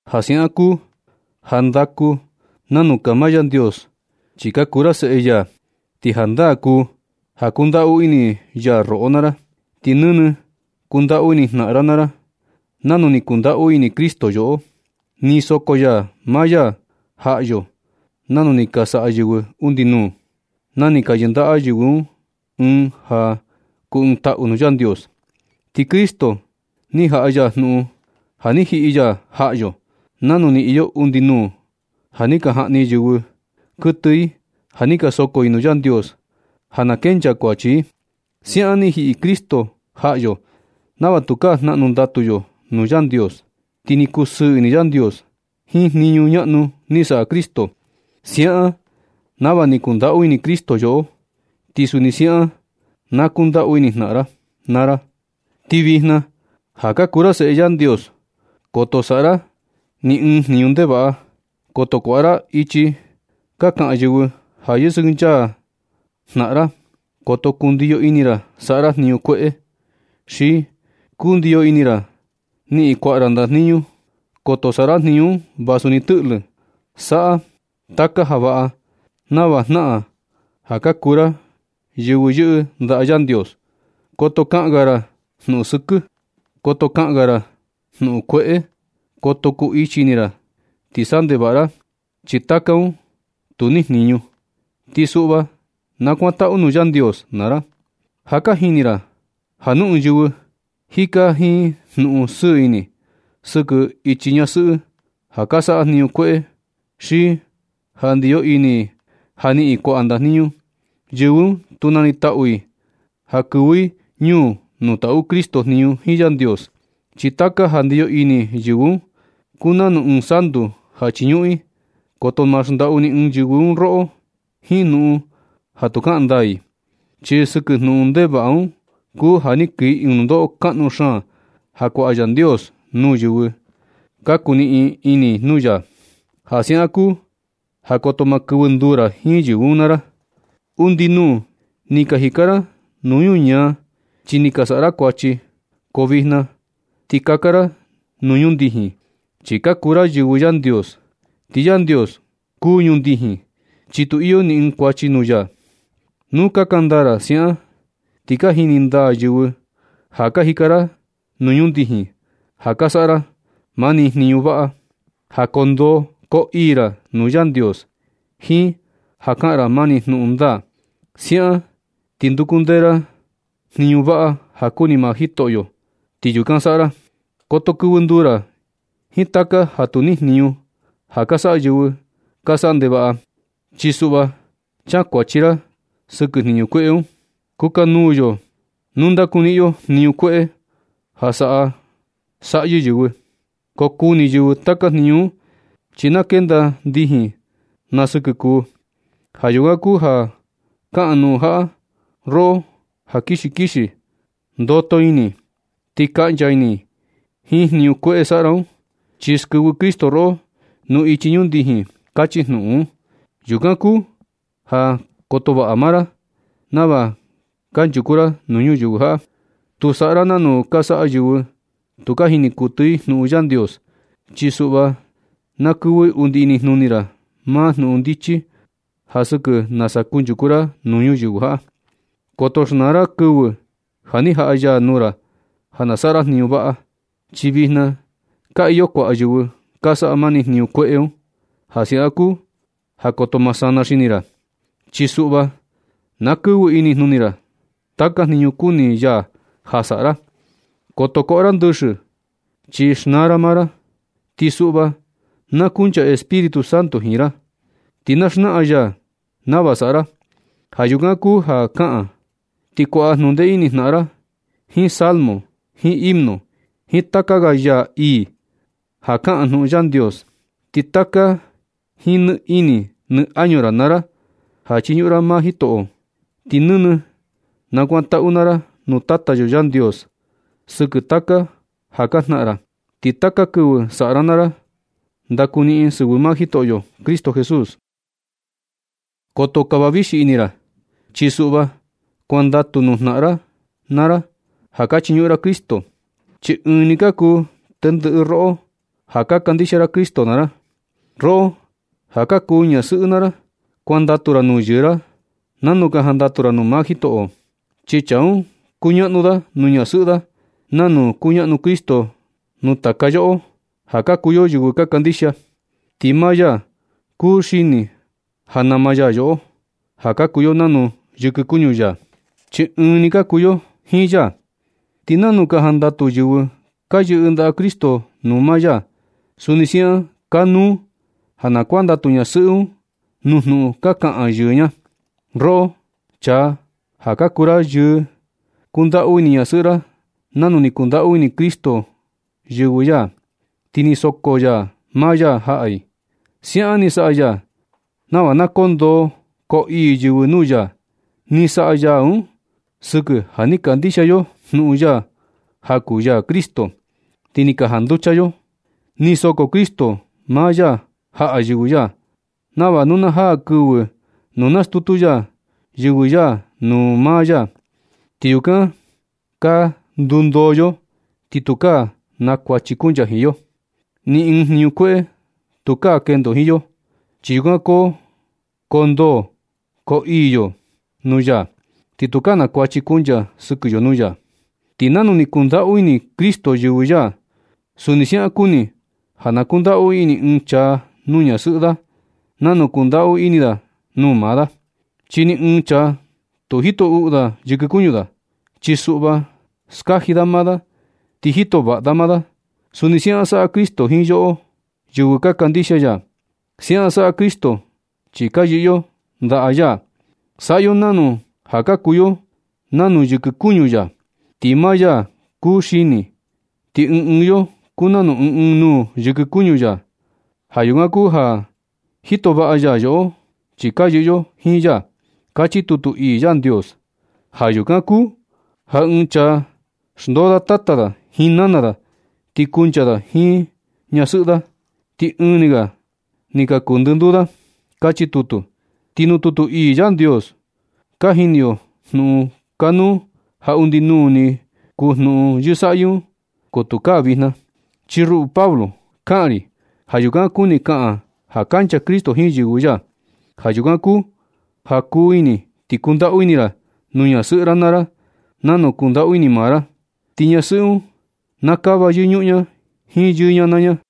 Ja siaꞌan kuu ja ndaku nanu kaa maa Yandios chi ka kuu ra seꞌe ya, ti jandaa kuu ja kundaꞌu ini ya roꞌo naa ra. Ti nɨnɨ kundaꞌu ini jnaꞌan naa ra nanu ni kundaꞌu ini Cristo yoꞌo. Ni soko ya maa ya jaꞌa yo nanu ni ka saꞌa yɨvɨ undi nuu, na ni ka yɨndaꞌa yɨvɨ un ɨɨn ja kuu ɨɨn taꞌu nuu Yandios. Ti Cristo ni jaꞌa ya jnuꞌun ja ni jiꞌi ya jaꞌa yo, nanu ni iyo undi nuu ja ni ka jaꞌni yɨvɨ kuɨtɨ i ja ni ka soko i nuu Yandios ja na kencha kuachi i. Siaꞌan ni jiꞌi Cristo jaꞌa yo nava tukaa jnaꞌnu ndatu yo nuu Yandios. Ti ni kusɨɨ ini Yandios jiin jniñu ñaꞌnu ni saꞌa Cristo. Siaꞌan nava ni kundaꞌu ini Cristo yoꞌo, ti suni siaꞌan na kundaꞌu ini jnaꞌan ra naa ra. Ti vijna ja ka kuu ra seꞌe Yandios, koto saꞌa ra ni ɨɨn jniñu ndevaꞌa. Koto kuaꞌa ra ichi ka kaꞌan yɨvɨ ja yɨsɨkɨnchaa ra jnaꞌan ra. Koto kundiyo ini ra saꞌa ra jniñu kueꞌe, xi kundiyo ini ra niꞌin kuaꞌa ra ndajniñu. Koto saꞌa ra jniñu un vasu ni tɨꞌlɨ. Saꞌa taka ja vaꞌa nava jnaꞌan ja kuu ra yɨvɨ yɨꞌɨ ndaꞌa Yandios. Koto kaꞌan ga ra jnuꞌun sɨkɨ. Koto kaꞌan ga ra jnuꞌun kueꞌe. Koto kuu ichi ini ra ti saꞌa ndevaꞌa ra. Chi taka un tu niꞌin jniñu. Ti suꞌva nakuantaꞌu nuu Yandios naa ra. Ja ka jini ra ja nu ɨɨn yɨvɨ jika jiin jnuꞌun sɨɨ ini, sɨkɨ ichi ñasɨꞌɨ ja ka saꞌa jniñu kueꞌe. Xi ja ndiyo ini i ja niꞌin i kuaꞌa ndajniñu, yɨvɨ un tu nanitaꞌu i ja kɨvɨ i ñuu nuu taꞌu Cristo jniñu jiin Yandios. Chi taka ja ndiyo ini yɨvɨ un kuu nanu ɨɨn santu ja chiñuꞌun i. Koto ma xndaꞌu ni ɨɨn yɨvɨ un roꞌo jiin jnuꞌun ja tu kaꞌan ndaa i, chi sɨkɨ jnuꞌun ndevaꞌa un kuu ja kii ɨɨn nundoꞌo kaꞌnu xaan ja kuaꞌa Yandios nuu yɨvɨ ka kuniꞌin ini nuu ya. Ja siaꞌan kuu ja koto ma kɨvɨ nduu ra jiin yɨvɨ un naa ra. Undi nuu ni ka jika ra nuu ñuñaa chi ni ka saꞌa ra kuachi. Ko vijna na ti kaka ra nuu ñundijin, chi ka kuu ra yɨvɨ Yandios. Ti Yandios kuu ñundijin, chi tu iyo ni ɨɨn kuachi nuu ya. Nu kaka ndaa ra siaꞌan ti ka jini ndaa yɨvɨ ja ka jika ra ñundijin, ja ka saꞌa ra mani jniñu vaꞌa, ja koo ndoo koo ii ra nuu Yandios, jiin ja kaꞌan ra mani jnuꞌun ndaa. Siaꞌan ti nduku ndee ra jniñu vaꞌa ja kuni maa Jitoꞌo, ti yukan saꞌa ra. Koto kɨvɨ nduu ra jiin taka ja tu niꞌin jniñu ja ka saꞌa yɨvɨ ka saꞌa ndevaꞌa. Chi suꞌva kankuachi ra sɨkɨ jniñu kueꞌe un. Kukanuu yo nu ndakuniꞌin yo jniñu kueꞌe ja saꞌa saꞌyɨ yɨvɨ. Ko kuni yɨvɨ taka jniñu un, chi na kenda ndijin na sɨkɨ kuu. Ja yukan kuu ja kaꞌan jnuꞌun jaꞌa: Roꞌo ja kixi kixi, ndoto ini. Ti kaꞌncha ini jiin jniñu kueꞌe saꞌa ra un, chi skɨvɨ Cristo roꞌo nuu ichi ñundijin. Kachi jnuꞌun un. Yukan kuu ja koto vaꞌa maa ra nava kanchuku ra nuu ñuyɨvɨ jaꞌa. Tu saꞌa ra nanu ka saꞌa yɨvɨ tu ka jini kuɨtɨ i jnuꞌun Yandios. Chi suꞌva na kɨvɨ undi inijnuni ra maa jnuꞌun xndichi ja sɨkɨ nasa kunchuku ra nuu ñuyɨvɨ jaꞌa. Koto xnaa ra kɨvɨ ja ni jaꞌa ya nuu ra ja na saꞌa ra jniñu vaꞌa, chi vijna ka iyo kuaꞌa yɨvɨ ka saꞌa mani jniñu kueꞌe un. Ja siaꞌan kuu ja koto ma sana xini ra, chi suꞌva na kɨvɨ inijnuni ra taka jniñu kuni ya ja saꞌa ra. Koto koꞌo ra ndɨxɨ chi xnaa ra maa ra. Ti suꞌva na kuncha Espíritu Santo jiin ra, ti na xnaꞌan ya nava saꞌa ra. Ja yukan kuu ja kaꞌan, ti kuaꞌa jnundee ini jnaꞌan ra jiin salmo, jiin himno, jiin taka ga yaa ii ja kaꞌan jnuꞌun Yandios. Ti kata jiin nɨ ini nɨ añu ra naa ra ja chiñuꞌun ra maa Jitoꞌo. Ti nɨnɨ nakuantaꞌu naa ra nuu Tata yo Yandios sɨkɨ taka ja ka jnaꞌan ra. Ti taka kɨvɨ saꞌa ra naa ra, ndakuniꞌin sɨvɨ maa Jitoꞌyo Cristo Jesús. Koto kava vixi ini ra, chi suꞌva kuandatu nuu jnaꞌan naa ra ja ka chiñuꞌun ra Cristo, chi ɨɨn ni ka kuu tendɨꞌɨ roꞌo ja ka kandixia ra Cristo naa ra. Roꞌo ja ka kuu ñasɨꞌɨ naa ra, kuandatu ra nuu yɨɨ ra nanu ka jandatu ra nuu maa Jitoꞌo. Chi chaa un kuñaꞌnu da nuu ñasɨꞌɨ da nanu kuñaꞌnu Cristo nuu taka yoꞌo, ja ka kuu yo yɨvɨ ka kandixia. Ti maa ya kuu xini ja nama ya yoꞌo, ja ka kuu yo nanu yɨkɨ kuñu ya, chi ɨɨn ni ka kuu yo jiin ya. Ti nanu ka jandatu yɨvɨ ka yɨꞌɨ ndaꞌa Cristo nuu maa ya, suni siaꞌan kanuu ja na kuandatu ñasɨꞌɨ un nuu jnuꞌun ka kaꞌan yɨɨ ña. Roꞌo chaa ja ka kuu ra yɨɨ, kundaꞌu ini ñasɨꞌɨ ra nanu ni kundaꞌu ini Cristo yɨvɨ ya, ti ni soko ya maa ya jaꞌa i. Siaꞌan ni saꞌa ya nava na koo ndoo koo ii yɨvɨ nuu ya. Ni saꞌa ya un sɨkɨ ja ni kandixia yo jnuꞌun ya ja kuu ya Cristo, ti ni ka janducha yo. Ni soko Cristo maa ya jaꞌa yɨvɨ ya, nava nu na jaa kɨvɨ nu nastutu ya yɨvɨ ya nuu maa ya, ti yukan ka ndundoo yo. Ti tukaa na kuachi kuncha jiin yo. Ni ɨɨn jniñu kueꞌe tukaa kendo jiin yo, chi yukan koo ndoo koo ii yo nuu ya, ti tukaa na kuachi kuncha sɨkɨ yo nuu ya. Ti nanu ni kundaꞌu ini Cristo yɨvɨ ya, suni siaꞌan kuni ja na kundaꞌu ini ɨɨn chaa nuu ñasɨꞌɨ da nanu kundaꞌu ini da nuu maa da. Chi ni ɨɨn chaa tu jito uꞌu da yɨkɨ kuñu da. Chi suꞌva, skaji da maa da ti jito vaꞌa da maa da. Suni siaꞌan saꞌa Cristo jiin yoꞌo, yɨvɨ ka kandixia ya. Siaꞌan saꞌa Cristo chi ka yɨꞌɨ yo ndaꞌa ya. Saꞌa yo nanu ja ka kuu yo nanu yɨkɨ kuñu ya, ti maa ya kuu xini, ti ɨɨn ɨɨn yo kuu nanu ɨɨn ɨɨn nuu yɨkɨ kuñu ya. Ja yukan kuu ja jito vaꞌa ya yoꞌo chi ka yɨꞌɨ yo jiin ya. Kachi tutu ii Yandios: “Ja yukan kuu ja ɨɨn chaa xndoo da tata da jiin nana da, ti kuncha da jiin ñasɨꞌɨ da, ti ɨɨn ni ga ni ka kuu ndɨnduu da”, kachi tutu. Ti nuu tutu ii Yandios un ka jini yo jnuꞌun kanuu ja undi nuu ni kuu jnuꞌun yɨsaꞌyɨ, ko tukaa vijna. Chi ruꞌu Pablo, kaꞌan ri ja yukan kuni kaꞌan ja kancha Cristo jiin yɨvɨ ya. Ja yukan kuu ja kuu ini ti kundaꞌu ini ra nuu ñasɨꞌɨ ra naa ra nanu kundaꞌu ini ra maa ra. Ti ñasɨꞌɨ un na kava yɨñuꞌun ña jiin yɨɨ ña naa ña.